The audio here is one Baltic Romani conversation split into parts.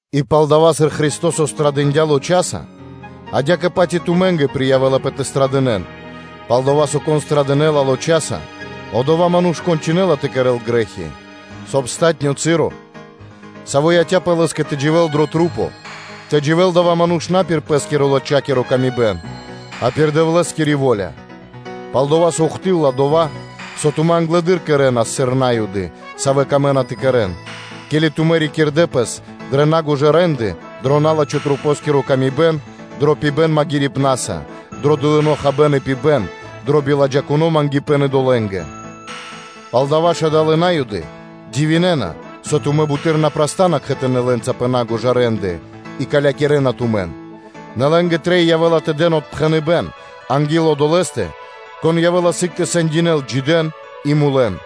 И палдава́, сыр Христо́со пирилыджалас пхарипэ́н дрэ лоч, адя́кэ-паць и тумэ́нгэ приявэлапэ тэ лыджа́н пхарипэ́н; пал-дова́ со кон злыджала пхарипэ́н лочаса, одова́ ману́ш мэкэ́ла тэ кэрэ́л грэ́хи, соб (кай) палатуно́ (последнё) часо, саво́ яця́пэ лэ́скэ тэ дживэ́л дрэ маса́, тэ дживэ́л адава́ ману́ш на пир пэ́скирэ-лочакиро тырдыпэ́н, а пир Дэвлэ́скири во́ля. Пал-дова́ со ухты́лла (до́си) дова́, со тумэ́ англэды́р кэрэ́нас, сыр На́юды, савэ́ камэ́на тэ кэрэ́н: ке́ли тумэ́ рикирдэ пэс дрэ на́гожа рэ́нды (де́лы), дро на́лачхо камибэн дрэ маса́, дро пибэ́н магирибнаса, дро дылыно́ хабэ́н и пибэ́н би меракиро, дро биладжакуно мангипэ́н идолэ́нгэ. Палдава́ ж адалэ́ На́юды дивинэна, со тумэ́ буты́р на праста́на кхэтанэ́ лэ́нца пэ на́гожа рэ́нды, и калякирэна тумэн, нэ лэ́нгэ трэй явэ́ла тэ дэн отпхэныбэ́н анги́л Одолэ́стэ, Кон явэ́ла сыг тэ сэндякирэ́л джидэн и мулэн.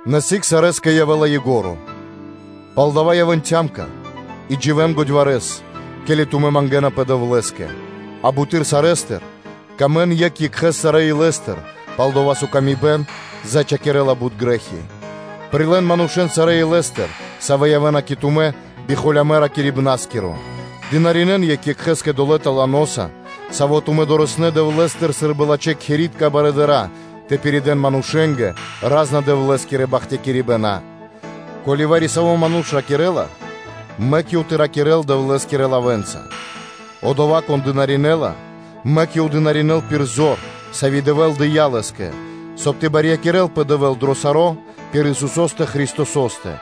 Нэ сыг сарэскэ явэ́ла ко́нцо (яго́ро): палдава́ ракхэ́нпэ и дживэ́н годьварэс, ке́ли тумэ́ мангэ́напэ Дэвлэ́скэ; а буты́р сарэ́стыр сыкавэ́н паты́в екх екхэ́скэ сарэ́ илэ́стыр, пал-дова́ со паты́в зачхакирэла бут грэ́хи; прилэ́н манушэ́н сарэ́ илэ́стыр, савэ́ явэ́на кэ тумэ́ би холямэ́ ракирибнаскиро; дынаринэ́н екх екхэ́скэ долэ́ таланоса, саво́ тумэ́ дорэснэ́ Дэвлэ́стыр сы́рбы лачхэ́ кхэри́тка барыдыра́ тэ пиридэ́н манушэ́нгэ ра́зна Дэвлэ́скирэ бахтякирибэна. Ко́ли вари-саво́ ману́ш ракирэ́ла, мэк ёв тэ ракирэ́л Дэвлэ́скирэ лавэ́нца; одова́ кон дынаринэла, мэк ёв тэ дынаринэ́л пир зор, сави́ Дэвэ́л дэ́ла лэ́скэ, соб (кай) тэ барьякирэлпэ Дэвэ́л дро саро́ пир Исусо́стэ Христосо́стэ,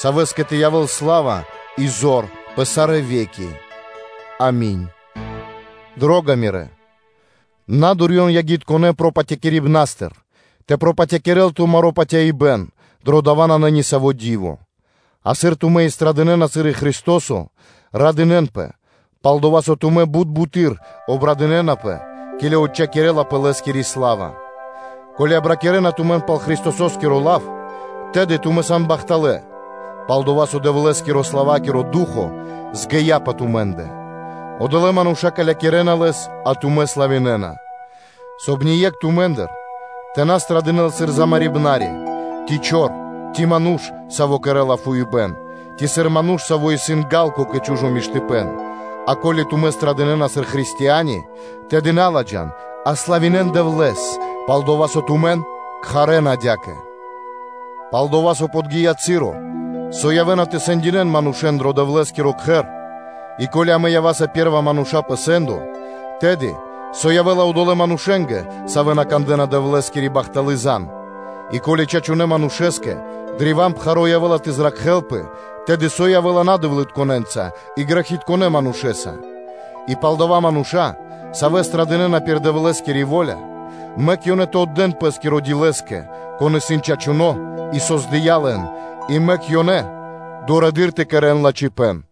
Савэ́скэ тэ явэ́л сла́ва и зор пэ сарэ́ ве́ки. Ами́нь. Мирэ́ дро́га! На дурьен ягитконэ́ пропатякирибнастыр тэ пропатякирэл тумаро́ патяибэ́н, дро дава́ нанэ нисаво́ ди́во; а сыр тумэ́ пирилыджана пхарипэ́н, сыр и Христо́со, радынэ́нпэ, пал-дова́ со тумэ́ бут буты́р обрадынэнапэ, ке́ли отчхакирэлапэ Лэ́скири сла́ва. Ко́ли обракирэна тумэн пал Христосо́скиро лав, тэды тумэ́ сан бахталэ́, пал-дова́ со Дэвлэ́скирэ-славакиро Ду́хо (Фа́но) згия пэ тумэ́ндэ: (одолэ́ мануша́ калякирэна Лэс, а тумэ́ славинэна). Соб (кай) ние́кх тумэ́ндыр тэ на злыджал пхарипэ́н сыр замарибнари (умарибнари), ци чор, ци ману́ш, саво́ кэрэ́ла фуипэ́н; ци сыр ману́ш, саво́ исын ґа́лко кэ чу́жо миштыпэ́н; а ко́ли тумэ́ пирилыджана пхарипэ́н сыр Христиани, тэды на ладжан, а славинэ́н Дэвлэ́с, пал-дова́ со тумэн кхарэ́на адя́кэ. Пал-дова́ со подги́я часо, со явэ́на тэ сэндинэ́н манушэ́н дро Дэвлэ́скиро Кхэр, и ко́ли амэ ява́са пэ́рва мануша́ пэ сэ́ндо, тэды, со явэ́ла одолэ́ манушэ́нгэ, савэ́ на кандэ́на Дэвлэ́скири бахталы́ зан (звесь)? И ко́ли чачунэ́ манушэ́скэ древа́н пхаро́ явэ́ла тэ зракхэлпэ, тэды, со явэ́ла надэвлытконэнца, и грэхитконэ́ манушэ́са? И палдава́ мануша́, савэ́ пирилыджана пхарипэ́н пир Дэвлэ́скири во́ля, мэк ёнэ тэ отдэ́н пэ́скиро ди Лэ́скэ, Кон исын чачуно́, и Кон создыя́ лэн, и мэк ёнэ дурэды́р тэ кэрэ́н лачхипэ́н.